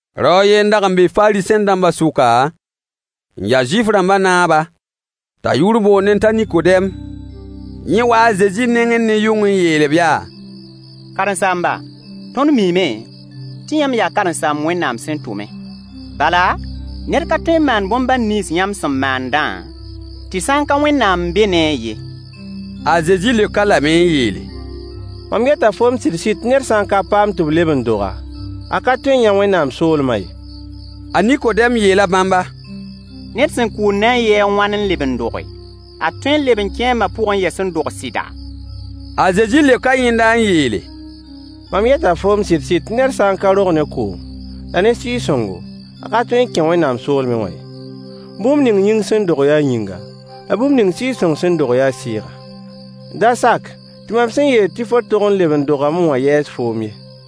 Rao a yen n dag n be Fariisẽ-dãmba sʋka, n ya Zuif-rãmbã naaba, t'a yʋʋr boondẽ t'a Nikodɛm. Yẽ waa a Zezi nengẽ ne yʋng n yeel-b yaa: Karen-saamba, tõnd miime tɩ yãmb yaa karen-saamb Wẽnnaam sẽn tʋme. Bala, ned ka tõe n maan bõn-bãn nins yãmb sẽn maandã, tɩ sã n ka Wẽnnaam n be ne-a ye. A Zezi leok-a lame n yeele: Mam yeta foom sɩd-sɩd tɩ ned sã n ka paam tɩ b leb n dog-a, a ka tõe n yã Wẽnnaam soolmã ye. A Nikodɛm yeela bãmba: Ned sẽn kʋʋl na n yɩɩ a wãn n leb n doge? A tõe n leb n kẽe a ma pʋgẽ yɛs n dog sɩda? A Zezi leoka yẽnda n yeele: Mam yeta foom sɩd-sɩd tɩ ned sã n ka rog ne koom la ne Sɩɩg-sõngo, a ka tõe n kẽ Wẽnnaam soolmẽ wã ye. Bũmb ning yĩng sẽn dog yaa yĩnga, la bũmb ning Sɩɩg-sõng sẽn dog yaa sɩɩga. Da sak tɩ mam sẽn yeel tɩ fo tog n leb n dogame wã yɛɛs foom ye.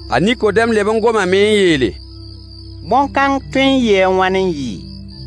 A Nikodɛm leb n gomame n yeele: Bõn-kãng tõe n yɩɩ a wãn n yɩ?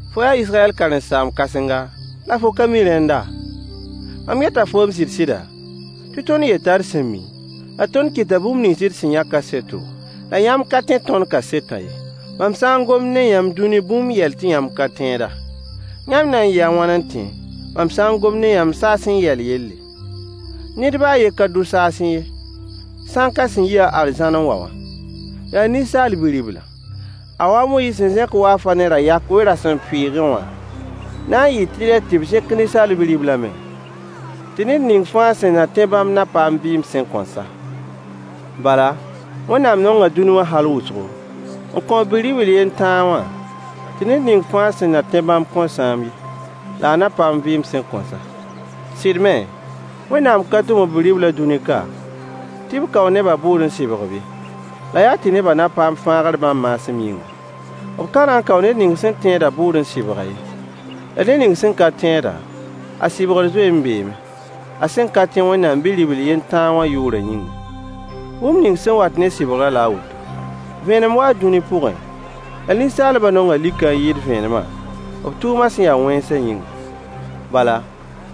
Fo yaa Israyɛll karen-saam-kãsenga, la fo ka mi rẽnda? Mam yeta foom sɩd-sɩda, tɩ tõnd yeta d sẽn mi, la tõnd kɩta bũmb nins d sẽn yã kaseto, la yãmb ka tẽ tõnd kasetã ye. Mam sã n gom ne yãmb dũni bũmb yɛl tɩ yãmb ka tẽeda, yãmb na n yɩɩ a wãn n tẽ, mam sã n gom ne yãmb saasẽ yɛl yelle? Ned baa a yen ka dʋ saasẽ ye, sã n ka sẽn yi-a arzãn n wa wã: yaa Ninsaal Bi-riblã. A wa a Moyiis sẽn zẽk waafã ne ra-yak we-rasempʋɩɩgẽ wã, na n yɩɩ tɩlɛ tɩ b zẽk Ninsaal Bi-riblã me, tɩ ned ning fãa sẽn na tẽ bãmb na paam vɩɩm sẽn kõn sa. Bala, Wẽnnaam nonga dũni wã hal wʋsgo, n kõ b Bi-ribl yen tãa wã, tɩ ned ning fãa sẽn na tẽ n bãmb kõn sãam ye, la a na paam vɩɩm sẽn kõn sa. Sɩd me, Wẽnnaam ka tʋm b Bi-riblã dũni ka tɩ b kao nebã bʋʋd n sɩbg-b ye, la yaa tɩ nebã na paam fãagr bãmb maasem yĩnga. B ka na n kao ned ning sẽn tẽedã bʋʋd n sɩbg-a ye. La ned ning sẽn ka tẽedã, a sɩbgr zoe n beeme, a sẽn ka tẽ Wẽnnaam Bi-ribl yen tãa wã yʋʋrã yĩnga. Bũmb ning sẽn wat ne sɩbgrã la a woto: vẽenem waa dũni pʋgẽ, la ninsaalbã nonga likã n yɩɩd vẽenemã, b tʋʋmã sẽn ya wẽnsã yĩnga. Bala,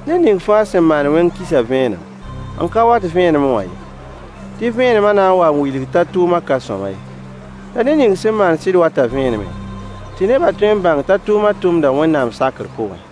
ned ning fãa sẽn maand wẽng kisa vẽenem, n ka wat vẽenemẽ wã ye, tɩ vẽenemã na n wa n wilg t'a tʋʋmã ka sõama ye. La ned ning sẽn maand sɩd wata vẽenemẽ, tɩ nebã tõe n bãng t'a tʋʋmã tʋmda Wẽnnaam sakr pʋgẽ.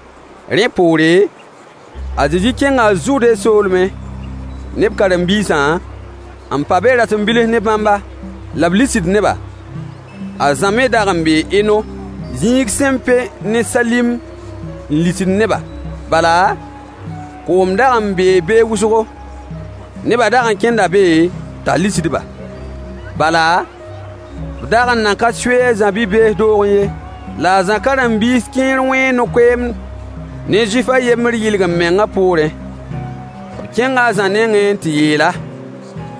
Rẽ poore, a Zezi kẽnga Zude soolmẽ ne b karen-biisã, n pa be rasem bilf ne bãmba, la b lisd neba. A Zã me dag n bee Eno, zĩig sẽn pẽ ne Salim n lisd neba, bala, koom dag n bee be wʋsgo. Nebã dag n kẽnda be t'a lisd-ba. Bala, b dag nan ka sui a Zã bi-bees doogẽ ye. La a Zã karen-biis kẽer wẽe no-koeemd ne Zuif a yembr yɩlg-m-mengã poorẽ. B kẽnga a Zã nengẽ n tɩ yeel-a: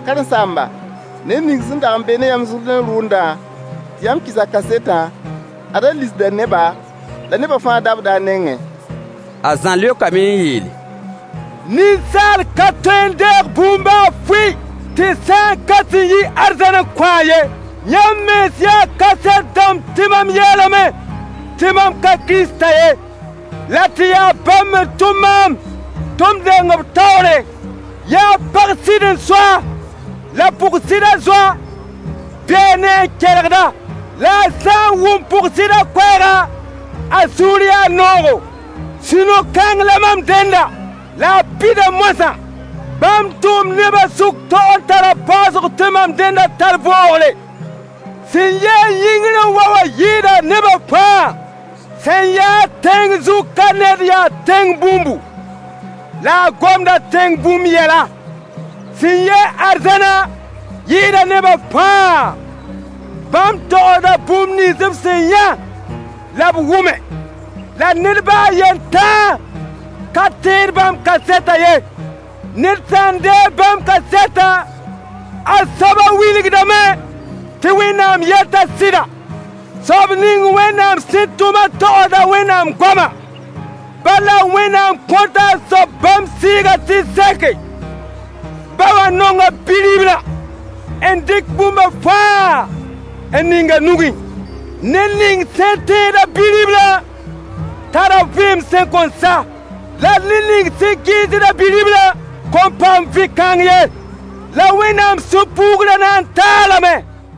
Karen-saamba, ned ning sẽn dag n be ne yãmb Zʋrdẽ rʋʋndã, tɩ yãmb kɩs a kasetã, ad a lisda neba, la nebã fãa dabda a nengẽ. A Zã leokame n yeele: Ninsaal ka tõe n deeg bũmb baa fʋɩ, tɩ sã n ka sẽn yi arzãn n kõ-a ye. Yãmb mens yaa kaset dãmb tɩ mam yeelame tɩ mam ka Kiristã ye, la tɩ yaa bãmb n tʋm maam tɩ m deng b taoore. Yaa pag sɩd n so-a. La pʋg-sɩdã zoa bee ne-a n kelgd-a, la a sã n wʋm pʋg-sɩdã koɛɛga, a sũur yaa noogo. Sũ-no-kãng la mam dẽndã, la a pida moasã. Bãmb tʋʋmd nebã sʋk tog n tara paoosg tɩ mam dẽndã tar boogre. Sẽn yi-a yĩngr n wa wã yɩɩda nebã fãa. Sẽn yaa-a tẽng zug ka ned yaa tẽng bũmbu, la a gomda tẽng bũmb yɛla. Sẽn yi-a arzãnã yɩɩda nebã fãa. Bãmb togsda bũmb nins b sẽn yã la b wʋme, la ned baa a yen tãa ka tẽed bãmb kasetã ye. Ned sã n deeg bãmb kasetã, a soabã wilgdame tɩ Wẽnnaam yeta sɩda. Soab ning Wẽnnaam sẽn tʋmã togsda Wẽnnaam goama, bala, Wẽnnaam kõta a soab bãmb Sɩɩgã tɩ seke. Ba wã nonga Bi-riblã, n dɩk bũmba fãa n ning a nugẽ. Ned ning sẽn tẽed-a Bi-riblã tara vɩɩm sẽn kõn sa. La ned ning sẽn kɩɩsd-a Bi-riblã kõn paam vɩ-kãng ye, la Wẽnnaam sũ-puugrã na n ta-a lame.